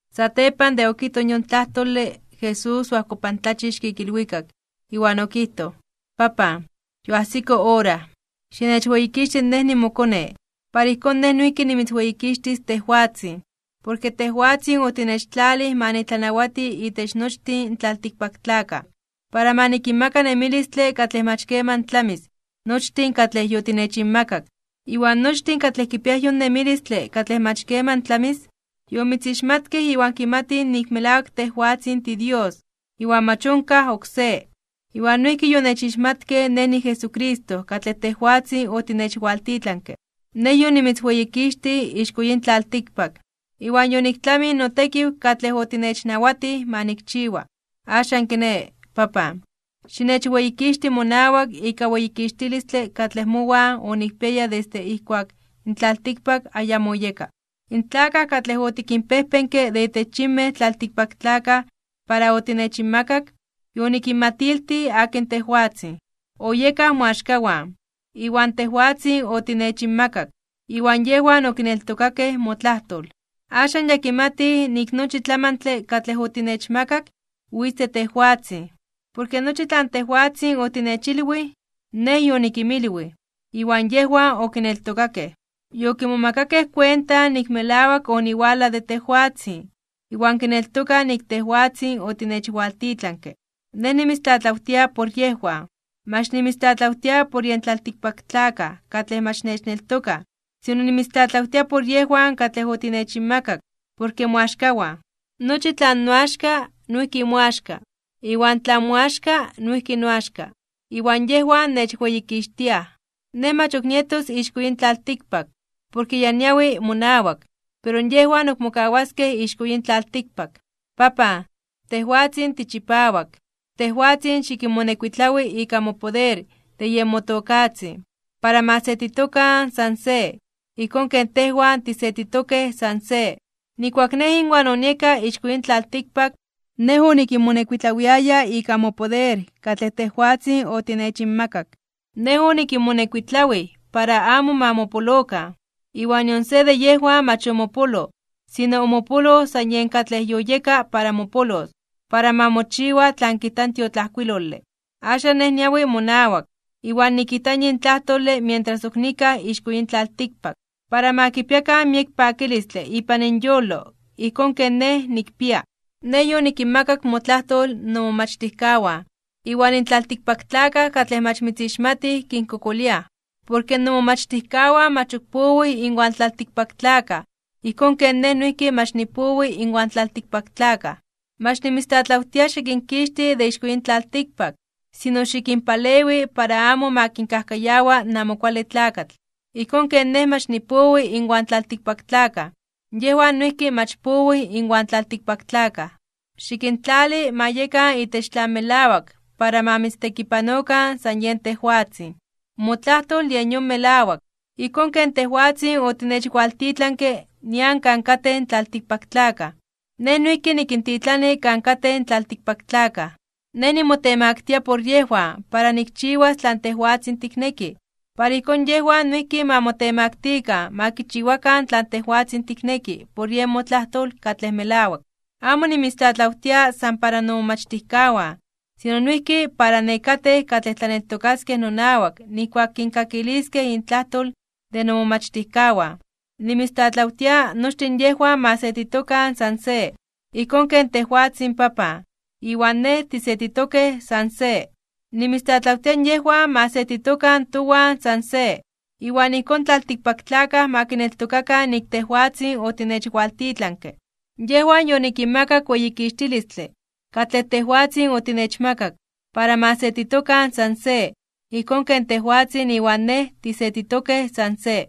Satepan de okijtoj yon tlajtole, Jesús oajkopantlachixke ik ilwikak, iwan okijtoj: ―Papan, yoajsiko ora. Xinechweyikixti Nej nimoKone, para ijkón Nej noijki nimitzweyikixtis tejwatzin. Porke tejwatzin otinechtlalij ma nitlanawati itech nochtin in tlaltikpaktlakaj, para ma nikinmaka nemilistle katlej mach keman tlamis nochtin katlej yotinechinmakak. Iwan nochtin katlej kipiaj yon nemilistle katlej mach keman tlamis, yomitzixmatkej iwan kimatij nik melawak tejwatzin tiDios, iwan mach onkaj oksé. Iwan noijki yonechixmatkej Nej niJesucristo katlej tejwatzin otinechwaltitlanke. ’Nej yonimitzweyikixtij ixko yin tlaltikpak. Iwan yoniktlamij notekiw katlej otinechnawatij ma nikchiwa. Axan kiné, Papan, xinechweyikixti monawak ika weyikixtilistle katlej mowan onikpiaya desde ijkuak in tlaltikpak ayamo oyeka. ’In tlakaj katlej otikinpejpenke de itech yinmej tlaltikpaktlakaj para otinechinmakak, yonikinmatiltij akin tejwatzin. Oyekaj moaxkawan, iwan tejwatzin otinechinmakak, iwan yejwan okineltokakej motlajtol. Axan ya kimatij nik nochi tlamantle katlej otinechmakak witz de tejwatzin. Porke nochi tlan tejwatzin otinechilwij, Nej yonikinmilwij, iwan yejwan okineltokakej. Yokimomakakej kuenta nik melawak oniwalaj de tejwatzin, iwan kineltokaj nik tejwatzin otinechwaltitlanke. ’Nej nimitztlatlawtia por yejwan. Mach nimitztlatlawtia por yen tlaltikpaktlakaj katlej mach nechneltokaj, sino nimitztlatlawtia por yejwan katlej otinechinmakak, porke moaxkawan. Nochi tlan noaxka noijki moaxka, iwan tlan moaxka noijki noaxka. Iwan yejwan nechweyikixtiaj. ’Nej mach ok nietos ixko yin tlaltikpak, porke ya niawi monawak, pero yejwan ok mokawaskej ixko yin tlaltikpak. Papan, tejwatzin tichipawak, tejwatzin xikinmonekuitlawi ika mopoder de yen motokatzin, para ma setitokan san se, ijkón ken tejwan tisetitokej san se. Nijkuak Nej inwan onieka ixko yin tlaltikpak, Nej onikinmonekuitlawiaya ika mopoder katlej tejwatzin otinechinmakak. Nej onikinmonekuitlawij para amo ma mopolokan, iwan nion se de yejwan mach omopoloj, sino omopoloj san yen katlej yoyeka para mopolos, para ma mochiwa tlan kijta in tiotlajkuilole. ’Axan Nej niawi monawak. Iwan nikijta yin tlajtole mientras ok nikaj ixko yin tlaltikpak, para ma kipiakan miek pakilistle ipan inyolo ijkón ken Nej nikpia. Nej yonikinmakak motlajtol nomomachtijkawan, iwan in tlaltikpaktlakaj katlej mach mitzixmatij kinkokoliaj, porke nomomachtijkawan mach ok powij inwan tlaltikpaktlakaj ijkón ken Nej noijki mach nipowi inwan tlaltikpaktlakaj. Mach nimitztlatlawtia xikinkixti de ixko yin tlaltikpak, sino xikinpalewi para amo ma kinkajkayawa in Amo Kuale Tlakatl. Ijkón ken Nej mach nipowi inwan tlaltikpaktlakaj, yejwan noijki mach powij inwan tlaltikpaktlakaj. Xikintlali ma yekan itech tlan melawak para ma mitztekipanokan san yen tejwatzin. Motlajtol yen yon melawak. Ijkón ken tejwatzin otinechwaltitlanke nian kan katej in tlaltikpaktlakaj, Nej noijki nikintitlani kan katej in tlaltikpaktlakaj. Nej nimotemaktia (nimotemaktilia) por yejwan para nikchiwas tlan tejwatzin tikneki, para ijkón yejwan noijki ma motemaktikan ma kichiwakan tlan tejwatzin tikneki por yen motlajtol katlej melawak. ’Amo nimitztlatlawtia san para nomomachtijkawan, sino noijki para nekatej katlej tlaneltokaskej nonawak nijkuak kinkakiliskej intlajtol de nomomachtijkawan. Nimitztlatlawtia nochtin yejwan ma setitokan san se. Ijkón ken tejwatzin, Papan, iwan Nej tisetitokej san se. Nimitztlatlawtia yejwan ma setitokan towan san se. Iwan ijkón in tlaltikpaktlakaj ma kineltokakan nik tejwatzin otinechwaltitlanke. Yejwan yonikinmakak weyikixtilistle katlej tejwatzin otinechmakak, para ma setitokan san se, ijkón ken tejwatzin iwan Nej tisetitokej san se.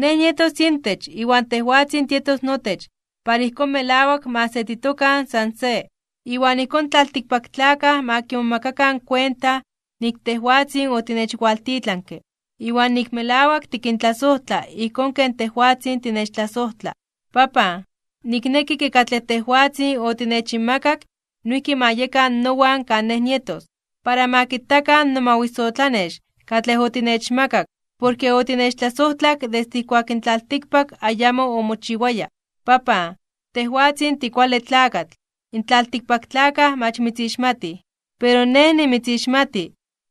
Nej nietos intech iwan tejwatzin tietos notech para ijkón melawak ma setitokan san se. Iwan ijkón in tlaltikpaktlakaj ma kimomakakan kuenta nik tejwatzin otinechwaltitlanke, iwan nik melawak tikintlasojtla ijkón ken tejwatzin tinechtlasojtla. ’Papan, nikneki ke katlej tejwatzin otinechinmakak noijki ma yekan nowan kan Nej nietos, para ma kitakan nomawisotlanex katlej otinechmakak porke otinechtlasojtlak desde ijkuak in tlaltikpak ayamo omochiwaya. Papan, tejwatzin tikuale tlakatl, in tlaltikpaktlakaj mach mitzixmatij. Pero Nej nimitzixmati,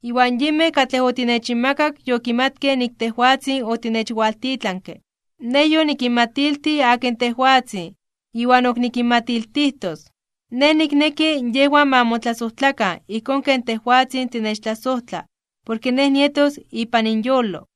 iwan yinmej katlej otinechinmakak yokimatkej nik tejwatzin otinechwaltitlanke. Nej yonikinmatiltij akin tejwatzin iwan ok nikinmatiltijtos. Nej nikneki yejwan ma motlasojtlakan ijkón ken tejwatzin tinechtlasojtla porke Nej nietos ipan inyolo.